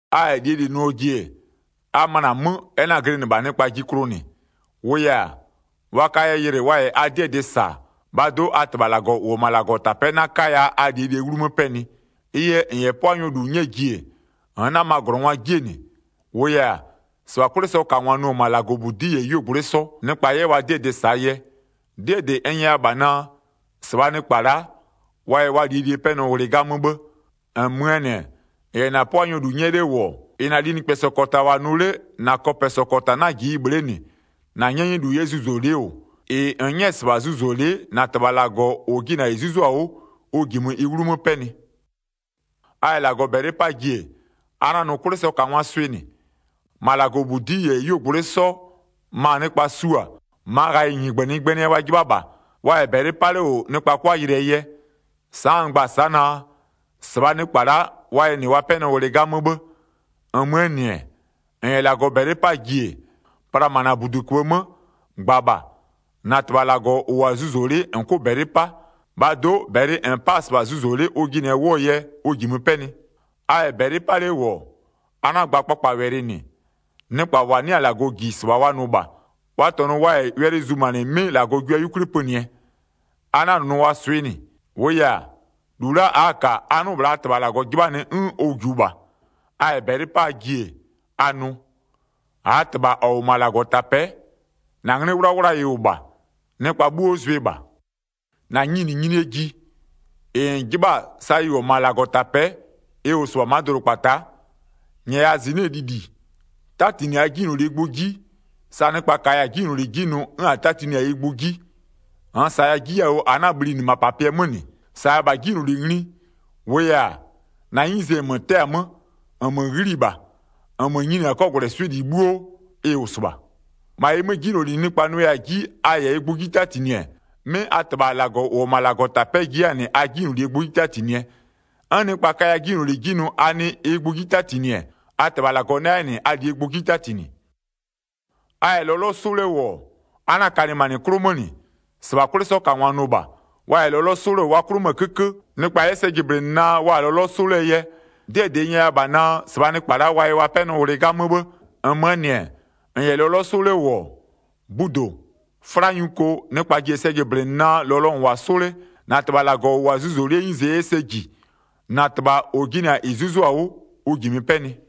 A -yɛ -lie -li nʋɔ ji-e, a möna 'mö, ɛ 'na-a glɩnɩ -bha nɩkpaa 'ji klʋ -nɩ, -wʋʋ yɛ-a, wa kaya yɩlɩ wa -yɛ a 'dɩɛ dɩ -sa, -bhaa do'o a -Tɩbha -Lagɔ -ʋ -wʋ-ɔ -ma -Lagɔtapɛ'ɛ 'na 'kaya a -lie -lie 'wlumö 'pɛnɩ. Ɩ yɛ -n -yɛ 'pʋanyɔ -lu 'nyɛɛ ji-e, -nn 'nama -glɔngwaa 'jie -nɩ, -wʋʋ yɛ-a, -sɩbha 'kwlɩsɔkangwa nʋ-ɔ -ma -Lagɔbudi'i -yɛ 'yuogblʋɩ'ɩ 'sɔ, nɩkpa 'yɛ wa 'dɩɛ dɩ -saa yɛ. 'Dɩɛ -dɩ n nyɛya -bha naa: -Sɩbhaa nɩkpa la'a, wa yɛ wa -lie -lie 'pɛnɔ ghlɩ 'gamö 'bhë. 3-Nmöö -nɩ-ɛ, -n -yɛ -na 'pʋanyɔ -lu 'nyɛ 'le -wʋ-ɔ, -ɩ -na linɩkpɛsɔ -kɔta -wʋ-a nʋ 'le -na kɔpɛsɔ -kɔta 'na-a -ji ɩ bhle'e -nɩ, 4-na 'nyɛnyɛlu 'yɛ zuzolɩ'ɩ -wʋ, -ɩ -n 'nyɛ-ɛ -sɩbha zuzolɩ'ɩ -na -Tɩbha -Lagɔ -ʋ jɩnɩ-a -ɩ 'zuzo-a 'wʋ, ʋ -jimö ɩ 'wlumö 'pɛnɩ. A -yɛ -Lagɔ -bɛlɩ 'paa ji-e, a 'na-a nʋ 'kwlɩsɔkangwaa swɩ -nɩ. -Ma -Lagɔbudi'i -yɛ 'yuogbɔtɩ'ɩ 'sɔ ma nɩkpa su-a, -maa ghayɩɛ 'nɩgbönɩnɩgbönɩɛ wa 'jɩbha -bha, wa -yɛ -bɛlɩ 'pa 'le -wʋ nɩkpa 'kʋa yɩlɩɛ yɛ. Sa'a n gba-a sa'a naa: -Sɩbhaa nɩkpa la'a wa yɛ -nɩ wa 'pɛnɔ ghlɩ 'gamö 'bhë. 6-Nmöö -nɩ-ɛ, -n -yɛ -Lagɔ -bɛlɩ 'paa ji-e, pla -ma -na -buduköbhë 'mö, -gba -bha, -na -Tɩbha -Lagɔ -ʋ -wʋ-a zuzolɩ'ɩ -n 'kʋ -bɛlɩ 'pa. -Bhaa do'o -bɛlɩ -n 'pa-a -sɩbha zuzolɩ'ɩ ʋ jɩnɩɛ 'wʋɔ yɛ, ʋ -jimö 'pɛnɩ. A -yɛ -bɛlɩ 'pa 'le -wʋ-ɔ, a 'na-a gba kpakpawɛlɩ -nɩ, nɩkpa -wa 'nɩ-a -Lagɔ -ji -sɩbha wa nʋ -bha. Wa -tɔnʋ wa -yɛ wɛlɩ zumanɩ 'mɩ -Lagɔ jua 'yukwli pönɩɛ. A 'na-a nʋ wa swɩ -nɩ, -wʋʋ yɛ-a, -lu a'a-a -ka a 'nʋ-ʋ -bhla a -Tɩbha -Lagɔ 'jɩbhanɩ 'n ʋ -jiʋ -bha. A -yɛ -bɛlɩ 'paa ji-e, a nʋ: -Aa -Tɩbha -ɔ -wʋ -ma -Lagɔtapɛ'ɛ, -na 'nglɩ 'wlawla ɩ -wʋ -bha, nɩkpa 'bhuo zʋɩ -bha. 10-Na nyininyinie ji, -ɩ -n 'jɩbha-a sa ɩ -wʋ-ɔ -ma -Lagɔtapɛ'ɛ, ɩ -wʋ -sɩbha ma'a dʋdʋkpata'a. 11-Nyɛya -zɩnɩ'ɩɛ lili. 'Tatinɩ -aa 'jinylolie gbʋ 'ji, sa nɩkpa -kaya-a 'jinyloli 'ji nʋ 'n a 'tatinɩ-a ɩ gbʋ 'ji. 13-Nn -saya 'ji yawʋ -a 'na-a bhlinɩ -mapapɩɛ 'mö -nɩ. -Saya 'jinyloli ngli. -Wʋʋ -yɛ-a, -na 'nyize -nmö 'tɛɛ-a 'mö, -nmö 'ghli-i -bha, -nmö nyini-a 'kɔgwlɛswɩ'ɩ -li 'bhuo, ɩ -wʋ -sɩbha. 14-Ma ɩ 'mö, 'jinyloli nɩkpa nʋya-a 'ji a -yɛ ɩ gbʋ 'ji 'tatinɩ-ɛ, 'mɩ a -Tɩbha -Lagɔ -ʋ -wʋ-ɔ -ma -Lagɔtapɛ'ɛ ji 'yɛ-a -nɩ a 'jinylolie gbʋ 'ji 'tatinɩɛ. 'N nɩkpa kaya 'jinyloli 'ji nʋ a nɩ ɩ gbʋ 'ji 'tatinɩ-ɛ, a -Tɩbha -Lagɔ 'na 'yɛ -nɩ a -lie gbʋ 'ji 'tatinɩ. A -yɛ lɔlɔ 'sʋ 'le -wʋ-ɔ, a 'na-a kalɩmanɩ 'klʋ 'mö -nɩ, -sɩbha 'kwlɩsɔkangwa nʋ -bha. Wa -yɛ lɔlɔ 'sʋ 'le -wʋ wa 'klʋ 'mö-ö 'kökö, nɩkpa 'yɛ sɛ jɩblɩnɩ naa wa-a lɔlɔ 'sʋ 'lee yɛ. 'Dɩɛ -dɩ n nyɛya -bha naa, -sɩbhaa nɩkpa la'a wa yɛ wa 'pɛnɔ ghlɩ 'gamö 'bhë. 17-Nmöö -nɩ-ɛ, -n -yɛ lɔlɔ 'sʋ 'le -wʋ-ɔ, budo, 'fla nyuko, nɩkpa ji-e sɛ jɩblɩnɩ naa lɔlɔ -n -wʋ-a 'sʋ 'le, -na -Tɩbha -Lagɔ -ʋ -wʋ-a zuzolɩ'ɩɛ 'nyize 'yɛ sɛ -ji. -Na -Tɩbha -ʋ jɩnɩ-a -ɩ 'zuzo-a 'wʋ, ʋ -jimö 'pɛnɩ.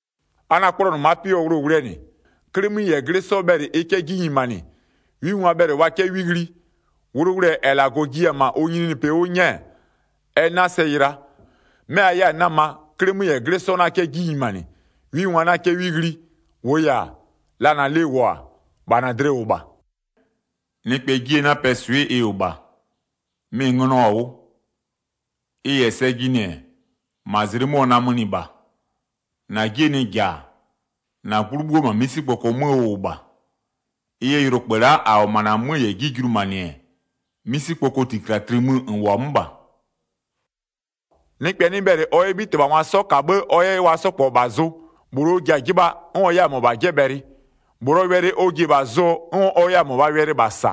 A 'na-a 'kplɔnʋ ma'a 'pɩ 'wʋɔ wʋlʋwʋlʋɛ -nɩ, 'klɩmö -yɛ 'glɩ 'sɔ bhɛlɩ ɩ 'kɛ 'ji nyimanɩ, 'wingwa bhɛlɩ wa 'kɛ 'wi ghli. Wʋlʋwʋlʋɛ -ɛ -Lagɔ jiya-a -ma ʋ nyininyinipɩ 'wʋ 'nyɛɛ, ɛ 'na sɛ yɩla, 'mɛ a 'yɛ-a 'nama 'Klɩmö -yɛ 'glɩ 'sɔ 'na 'kɛ 'ji nyimanɩ, 'wingwa 'na 'kɛ 'wi ghli. 21-Wʋʋ yɛ-a, la -na lɩ -wʋ-a, -bha -na dlɩ -wʋ -bha. Nɩkpɛɛ 'jie 'napɛɛ swɩ'ɩ ɩ -wʋ -bha, mɩ-ɩ ngönɔ-a 'wʋ. Ɩ -yɛ sɛ jɩnɩ-ɛ, -ma zlɩ 'mö ɔ namönɩ -bha. 23-Na 'jie nɩ -ja-a, -na 'gblʋ 'bhuo -ma 'misikpoko 'mö ʋ -wʋ -bha. Ɩ yɛ yʋlokpë la'a -a -wʋ-ɔ -ma -na 'mö -yɛ 'ji julumanɩ-ɛ, 'misikpokoo -tlikati mö -n -wʋ-a 'mö -bha. Nɩkpɛ 'nɩ bhɛlɩ ɔ 'yɛ 'bhitɩbhangwa 'sɔ -ka 'bhë ɔ 'yɛ wa 'sɔ -kpɔ -bha zʋ. -Bhlʋ ɔ ji-a 'jɩbhaa 'n ɔ 'yɛ-a -mɔbha 'jɛbhɛlɩ. -Bhlʋɔ wɛlɩ ɔ ji-e -bha zʋɔ 'n ɔ 'yɛ-a -mɔbhaa wɛlɩ -bha -sa.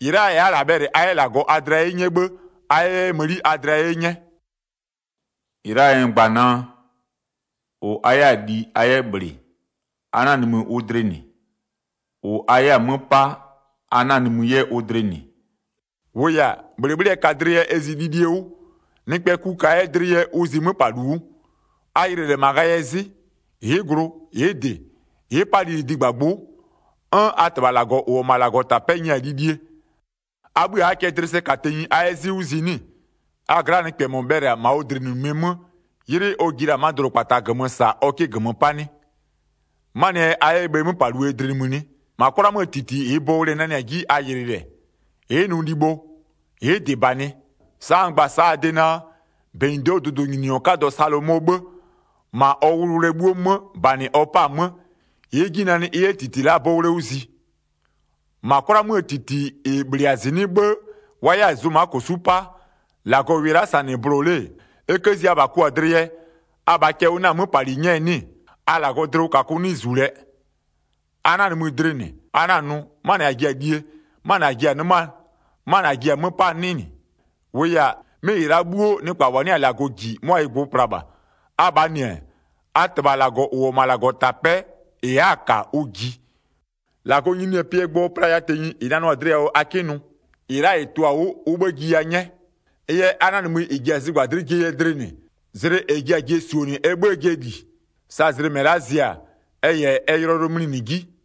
-Ɩ la'aa yɛ a'a -lɛ bhɛlɩ a 'yɛ -Lagɔ a dlɩa 'ye 'nyɛ 'bhë a 'yɛ 'yɛ mëni a dlɩa 'ye 'nyɛ. A 'tɛnɩ -Lagɔ dlɩ 25-Ɩ la'aa yɛ n gba-a a de naa: -Ʋ a 'yɛ-a li a 'yɛ -bhlɩ a 'na-a nimï ʋ dlɩ -nɩ. -Ʋ a 'yɛ-a 'mö 'pa a 'na-a nimï 'yɛ ʋ dlɩ -nɩ. -Wʋʋ yɛ-a, -bhlɩbhlɩɛ ka dlɩ yɛ ɛ zi lilie 'wʋ, nɩkpɛɛ ku ka 'yɛ dlɩ yɛ ʋ zi 'möpalu 'wʋ. A yɩlɩ -lɛ -ma ghayɩɛ 'zɩ. Ɩ'ɩ glʋ, ɩ'ɩ -dɩ, ɩ'ɩ 'pa lili -digbagbʋ'ʋ, 'n a -Tɩbha -Lagɔ -ʋ -wʋ-ɔ -ma -Lagɔtapɛ'ɛ nyɩɩ-a lilie. A 'bhï a'aa cɛ dlɩ sɛ -ka tenyi a 'yɛ 'zɩ 'wʋ zi 'nɩ-ɩ? A gla'aa nɩkpɛ -mɔ bhɛlɩ-a -ma ɔ dlɩnimïnimie 'mö 'ylɩ ɔ ji la-a ma'a dʋdʋkpata -gömö -saa ɔ 'kɩ -gömö 'pa 'nɩ? 'Manɩɛ yɛ a 'yɛ bhe 'möpaluo dlɩ nimï 'nɩ? -Ma 'kwla 'möö -titi -ɩɩ bowle-e nanɩ-a 'ji a yɩlɩɩ -lɛ. Ɩ'ɩ nʋ libho, ɩ'ɩ -dɩ -banɩ. Sa'a n gba-a sa'a a de naa, -benyido'oo dʋdʋnyininyɔ 'kadɔ Salomɔɔ 'bhë, -ma ɔ wʋlʋwʋlʋɛ 'bhuo 'mö -banɩ ɔ 'pa-a 'mö, ɩ'ɩ 'ji nanɩ ɩ 'yɛ -titi la'aa 'bowle 'wʋ zi. 30-Ma 'kwla 'möö -titi -ɩ -bhlɩ-a -zɩnɩ'ɩ 'bhë wa 'yɛ-a zʋma -kosu'u 'pa, -Lagɔ -wɩɩ la'a -sa -nɩ bʋlɔ-a 'le, e 'kë zi abha kɔ-a dlɩ yɛ, abhaa cɛ ʋ 'na-a 'möpali 'nyɛ 'nɩ-ɩ? A -Lagɔɔ dlɩwʋkakʋ 'nɩ -zu lɛɛ! A 'na-a nimï dlɩ -nɩ: A 'na-a nʋ: 'Manɩ -a ji-a lie, 'manɩ -a ji-a 'nɩmaa, 'manɩ -a ji-a 'mö 'paa 'nɩ -nɩ. 32-Wʋʋ yɛ-a, 'mɩ -ɩ la'a 'bhuo, nɩkpa -wa 'nɩ-a -Lagɔ -ji 'mʋa ɩ gbʋ pla -bha. Abhaa -nɩ-ɛ, a -Tɩbha -Lagɔ -ʋ -wʋ-ɔ -ma -Lagɔtapɛ'ɛ -ɩ a'a-a -ka, ʋ -jiɩ. 33-Lagɔɔ nyininyinipɩɛ gbʋ playa tenyi -ɩ nanʋ-a dlɩ yawʋ a 'kɩ nʋ. -Ɩ la'a -ɩ tʋ-a 'wʋ ʋ 'bhë jiya 'nyɛ. Ɩ yɛ a 'na-a nimï -ɩ ji-a zɩgbadlɩ'ɩ jie yɛ dlɩ -nɩ zlɩ -ɛ ji-a zɩɛ -su-o -nɩ ɛ 'bhëë jɩɛ -li. Sa zlɩ -mɛ la'a zɩ-a ɛ -yɛ ɛ yʋlɔyʋlʋɛ mlinɩ 'ji.